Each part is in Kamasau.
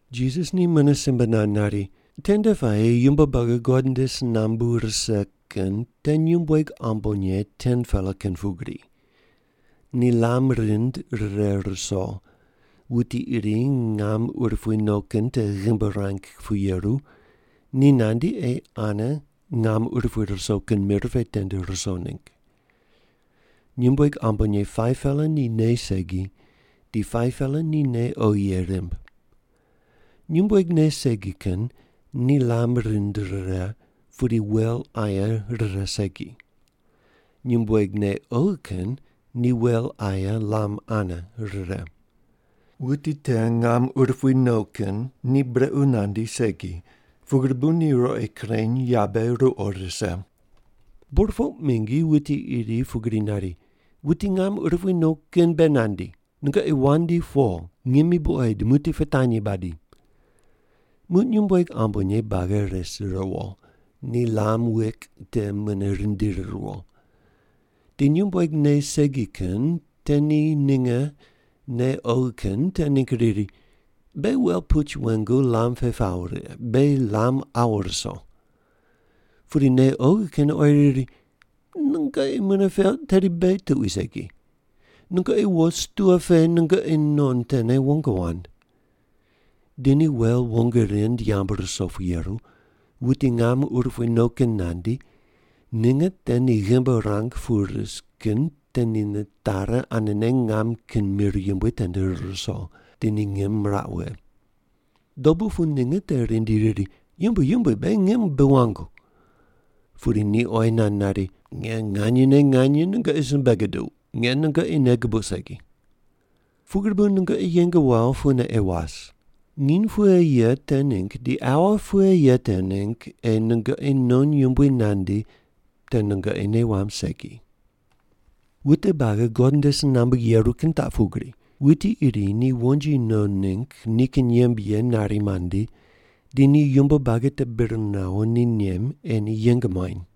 Jisas ni mune simbe nand nari, “Tende puayi yumbo buagi God nde si nambu rise kin te nyumbueg ambonye 10-pela kin pugri. Ni lam rind rire ruso, wuti iri ngam urupui no kin te ghimbi ruang pu yeru, ni nandi ei ane ngam urupui ruso kin mir pe tende ruso ningg. Nyumbueg ambonye 5-pela ni nei segi, di 5-pela ni nei oghi ye rimb. Nyumbueg nei segi kin ni lam rind rire, pudi wel aye rire segi. Nyumbueg nei oghi kin ni wel aye lam ane rire. Wuti te ngam urupui no kin ni brequ nandi segi, pugri bu ni ruqoi kureny, yabe ruqo rise. “Burpoq mingi wuti iri pugri nari, ‘Wuti ngam urupui no kin be nandi. Nungoqi wandi po, ngimi buqoid, muqdi pitanyi badi.’ Muq nyumbueg ambonye buagi res riwo, ni lam wik te mune rindiri riwo. Di nyumbueg nei segi kin te ni ninge nei oghi kin te ningg riri, ‘Beghi wel puch wengu lam pe pawo righe, beghi lam awu ruso.’ Pudi nei oghi kin oyi riri, ‘Nungoqi mune peuq tedi beghi tuqui segi. Nungoqi wo, stua pe nungoqi non tene wong wand.’ Di ni wel wong rind yamb ruso pu yeru, wuti ngam urupui no kin nandi, ninge te ni ghimbi ruang pu ris kin te ni nitari anene ngam kin mir yumbui tende rir ruso, di ni ngim miraq wughe. Dobu pu ninge te rindi riri, ‘Yumbui, yumbui, beghi ngim bi wangu.’ Pudi ni oyi nand nari, ‘Nge nganyene nganye nungoqi simbe guduq, nge nungoqi nei gubuq segi.’ “Pugri bu nungoqi yeng wawo pune ei was. Nginy pughe ye te ningg di aua pughe ye te ningg ei nungoqi non Yumbui nandi te nungoqi nei wamb segi. “Wute buagi God nde si nambu yeru kin taq pugri: wuti iri ni wonji no ningg nikin yembe ye nari mandi, di ni yumbo buagi te bir nawo ni nem ei ni yeng muany.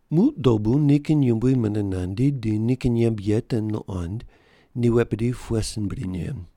“Muq dobu nikin yumbui mune nandi di nikin yembe ye te nuqond ni wet bidi pughe sin bri men.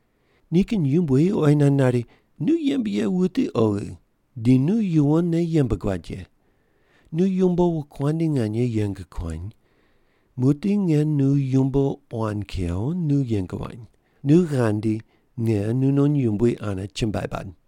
Nikin yumbui oyi nand nari, ‘Nu yembe ye wuti oghi di nu yuwonne yembe guad ye. Nu yumbo wokuandi nganye yeng kuany. Muqdi nge nu yumbo quan kew nu yeng wany. Nu ghandi nge nunon yumbui ane chumbuai bad.’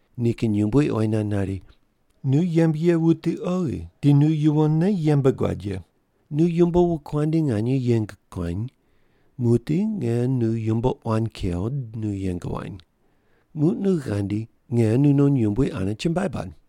Nikin yumbui oyi nand nari, ‘Nu yembe ye wuti oghi di nu yuwonne yembe guad ye. Nu yumbo wokuandi nganye yeng kuany. Muqdi nge nu yumbo quan kew nu yeng wany. Muq nu ghandi nge nunon yumbui ane chumbuai bad.’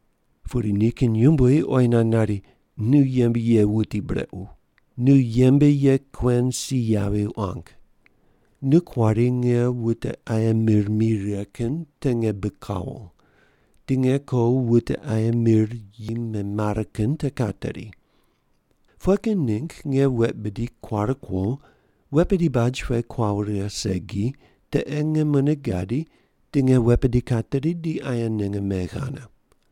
Pudi nikin yumbui oyi nand nari, ‘Nu yembe ye wuti brequ. Nu yembe ye kuen si yavi quang. Nu kuari nge wute aye mir mi righe kin te nge bi kawo, di nge ko wute aye mir yi memare kin te kateri. Pughe kin ningg nge wet bidi kuare kuo, wet bidi baj pe kuawo righe segi, te ei nge mune gadi di nge wet bidi kateri, di aye ninge megh ane.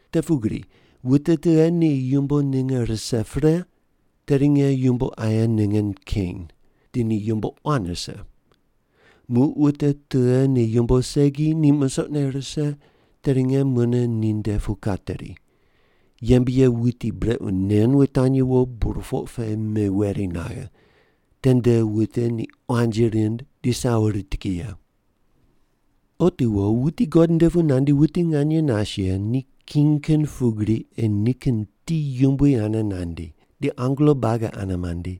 Te pugri wute tughe ni yumbo ninge rise pre, tedi nge yumbo aye ninge keny, di ni yumbo quan rise. Muq wute tughe ni yumbo segi, ni musoqne rise, tedi nge mune ninde pu kateri. Yembe ye wuti brequ nen wutanyi wo, burpoq pe meweri naghe. Tende wute ni quanji rind di sawo rit ki ye’.” “Otiwo wuti God nde pu nandi wuti nganye nas ye ni king kin pugri ei nikin ti yumbui ane nandi, di angelo buagi ane mandi,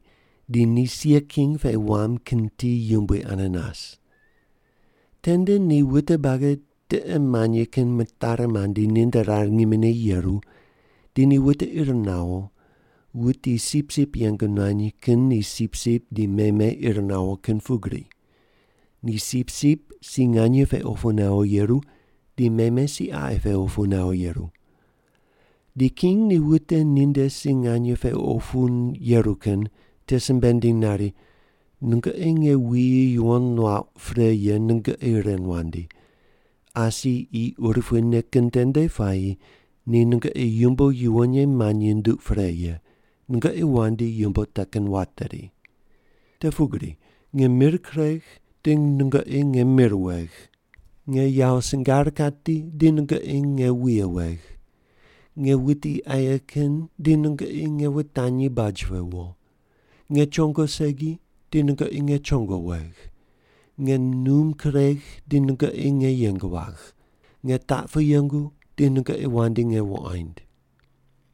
di ni sia king pe wam kin ti yumbui ane nas. Tende ni wute buagi tiqe manyi kin mitari mandi ninde rar ngimine yeru, di ni wute ir nawo, wuti sipsip yeng nuany kin ni sipsip di meme ir nawo kin pugri. Ni sipsip si nganye pe opu nawo yeru, di meme si qaqi pe opu nawo yeru. Di king ni wute ninde si nganye pe opu yeru kin te simbe nindiny nari, ‘Nungoqi nge wuyi yuwon nuauq pre ye nungoqi ren wandi. Asi qi urupuine kin tende puayi ni nungoqi yumbo yuwon ye manyi nunduq pre ye. Nungoqi wandi yumbo te kin wateri. Te pugri nge mir kuregh di nungoqi nge mir wegh, nge yawo singar kati di nungoqi nge wuye wegh, nge wuti aye kin di nungoqi nge wutanyi baj pe wo, nge chongo segi di nungoqi nge chongo wegh, nge num kuregh di nungoqi nge yeng wagh, nge taq pu yengu di nungoqi wandi nge wuqoind.’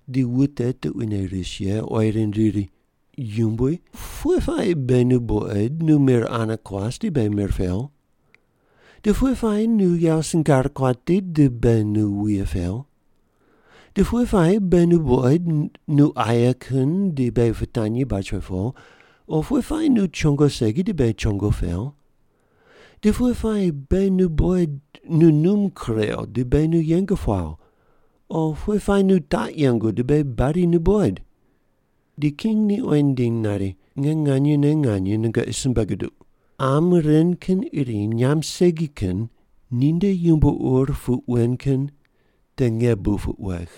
“Di wute tuquine ris ye oyi rind riri, ‘Yumbui, pughe puayi beghi nu buqoid nu mir ane kuas di beghi mir pew? Di pughe puayi nu yawo singar kuati di beghi nu wuye pew? Di pughe puayi beghi nu buqoid nu aye kin di beghi pitanyi baj pe po, o pughe puayi nu chongo segi di beghi chongo pew? Di pughe puayi beghi nu buqoid nu num kurew di beghi nu yeng puaw, o pughe puayi nu taq yengu di beghi badi nu buqoid’?” “Di king ni oyi nindiny nari, ‘Nge nganyene nganye nungoqi simbe guduq, qam ren kin iri nyamb segi kin ninde yumbo ur puq wen kin te nge bu puq wegh.’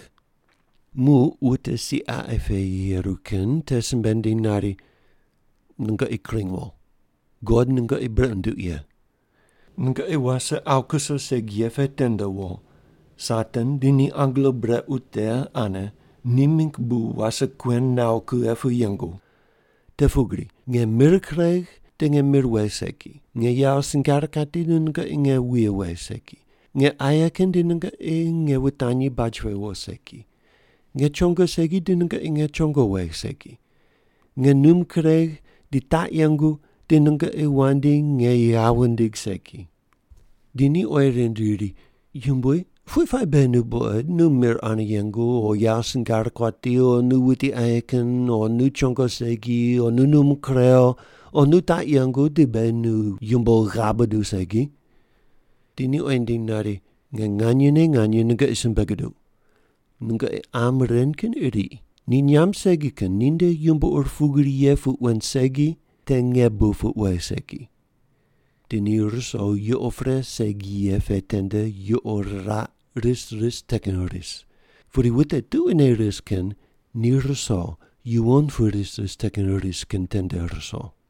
“Muq wute si qaqi pe yeru kin te simbe nindiny nari, ‘Nungoqi kring wo, God nungoqi brequ nunduq ye. Nungoqi wase awu kuso segi ye pe tende wo, Satan di ni angelo brequ te ane ni mingg bu wase kuen nawo kughe pu yengu. Te pugri nge mir kuregh di nge mir wegh segi, nge yawo singar kati di nungoqi nge wuye wegh segi, nge aye kin di nungoqi nge wutanyi baj pe wo segi, nge chongo segi di nungoqi nge chongo wegh segi, nge num kuregh di taq yengu di nungoqi wandi nge ghav wundigh segi.’ “Di ni oyi rind riri, ‘Yumbui, pughe puayi beghi nu buqoid nu mir ane yengu, o yawo singar kuati, o nu wuti aye kin, o nu chongo segi, o nu num kurew, o nu taq yengu di beghi nu yumbo ghav buduw segi?’ “Di ni oyi nindiny nari, ‘Nge nganyene nganye nungoqi simbe guduq, nungoqi qam ren kin iri ni nyamb segi kin ninde yumbo ur pugri ye puq wen segi te nge bu puq wegh segi.’ Di ni ruso yuqo pre segi ye pe tende yuqo riraq ris ris te kin ris, pudi wute tuquine ris kin ni ruso yuwon pu ris ris te kin ris kin tende ruso.”